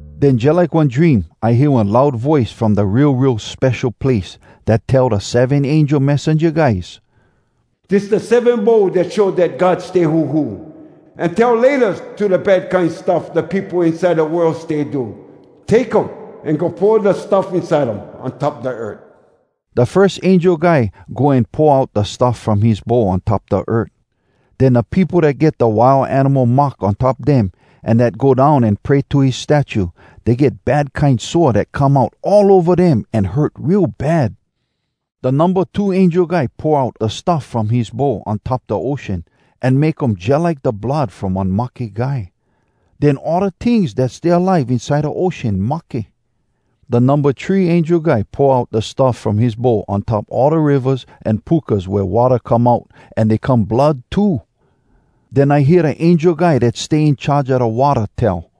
Den jalike one dream, I hear one loud voice from da Real Real Spesho Place dat tell da seven angel messenja guys, “Dis da seven bowl dat show dat God stay huhu, an tell ‘Laytas’ to da bad kine stuff da peopo inside da world stay do. Take um, an go pour da stuff inside um on top da earth.” Da firs angel guy go an pour out da stuff from his bowl on top da earth. Den da peopo dat get da Wild Animal mark on top dem an dat go down an pray to his statue, dey get bad kine sore dat come out all ova dem an hurt real bad. Da numba two angel guy pour out da stuff from his bowl on top da ocean, an make um jalike da blood from one mahke guy. Den all da tings dat stay alive inside da ocean mahke. Da numba three angel guy pour out da stuff from his bowl on top all da rivas an pukas wea watta come out, an dey come blood too. Den I hear da angel guy dat stay in charge a da watta tell,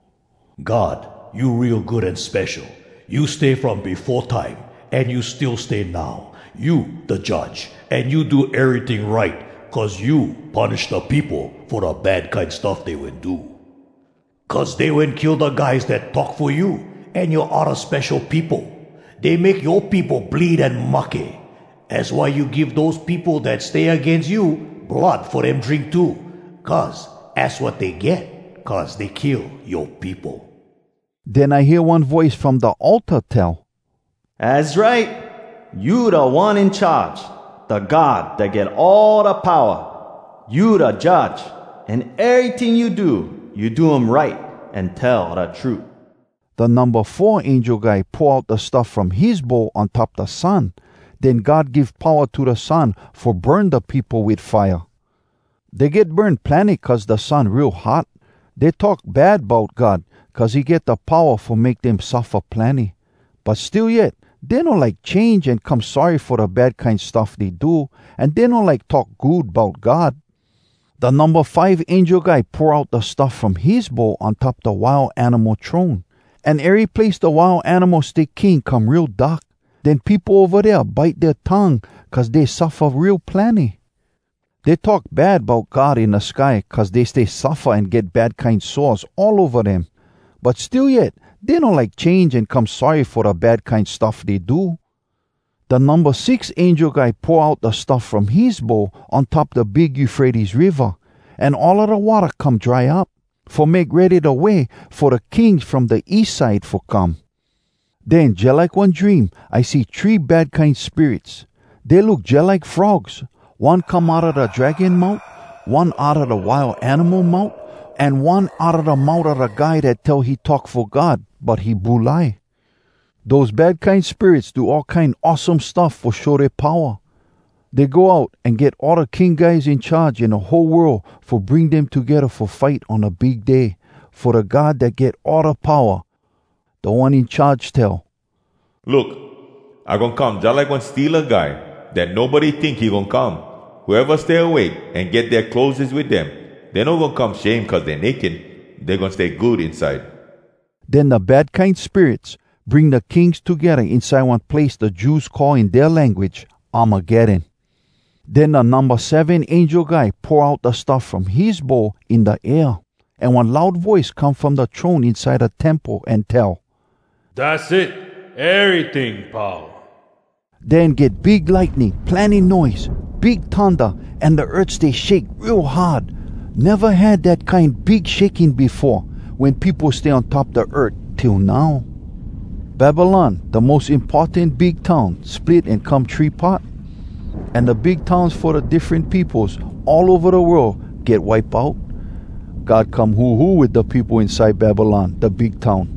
“God, you real good an spesho! You stay from befo time, an you still stay now. You da Judge, an you do eryting right. Cuz you punish da peopo fo da bad kine stuff dey wen do. Cuz dey wen kill da guys dat talk fo you, An yoa odda spesho peopo. Dey make yoa peopo bleed an mahke. Az why you give dose peopo dat stay agains you Blood fo dem drink too, Cuz az wat dey get cuz dey kill yoa peopo.” Den I hear one voice from da altar tell, “Az right! You Da One In Charge, Da God Dat Get All Da Powa. You da Judge. An eryting you do, you do um right An tell da trut.” Da numba four angel guy pour out da stuff from his bowl on top da sun. Den God give powa to da sun fo burn da peopo wit fire. Dey get burn plenny cuz da sun real hot. Dey talk bad bout God, cuz he get da powa fo make dem suffa plenny. But still yet, dey no like change an come sorry fo da bad kine stuff dey do, an dey no like talk good bout God. Da numba five angel guy pour out da stuff from his bowl on top da Wild Animal throne. An ery place da Wild Animal stay king come real dark. Den peopo ova dea bite dea tongue cuz dey suffa real plenny. Dey talk bad bout God in da sky cuz dey stay suffa an get bad kine sores all ova dem. But still yet dey no like change an come sorry fo da bad kine stuff dey do. Da numba six angel guy pour out da stuff from his bowl on top da big Eufrates Riva, an all da watta come dry up, fo make ready da way fo da kings from da east side fo come. Den jalike one dream, I see three bad kine spirits. Dey look jalike frogs. One come outa da dragon mout, one outa da Wild Animal mout, an one outa da mout a da guy dat tell he talk fo God, but he bulai. Dose bad kine spirits do all kine awesome stuff fo show dea powa. Dey go out an get all da king guys in charge in da whole world fo bring dem togedda fo fight on da Big Day fo Da God Dat Get All Da Powa. Da One In Charge tell, “Look! I goin come jalike one steala guy dat nobody tink he goin come! Whoeva stay awake, an get dea clotheses wit dem, dey no goin come shame cuz dey naked. Dey goin stay good inside.” Den da bad kine spirits bring da kings togedda inside one place da Jews call in dea language “Armageddon.” Den da numba seven angel guy pour out da stuff from his bowl in da air. An one loud voice come from da throne inside da temple an tell, “Dass it. Eryting pau.” Den get big lightning, plenny noise, big thunda, an da earth stay shake real hard—neva had dat kine big shaking befo, wen peopo stay on top da earth, till now. Babylon, da mos importan big town, split an come three part. An da big towns fo da diffren peopos all ova da world get wipe out. God come huhu wit da peopo inside Babylon, da big town.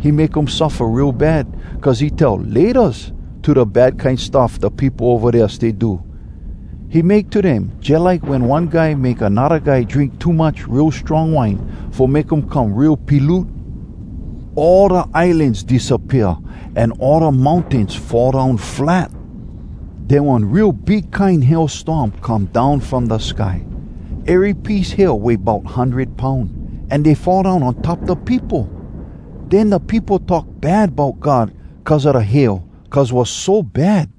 He make um suffa real bad, cuz he tell “Laytas” to da bad kine stuff da peopo ova dea stay do. He make to dem jalike wen one guy make anodda guy drink too much real strong wine, fo make um come real piloot. All da islans disappea, an all da mountains fall down flat! Den one real big kine hail storm come down from da sky. Ery piece hail weigh bout hundred poun, an dey fall down on top da peopo! Den da peopo talk bad bout God cuz a da hail, cuz was so bad.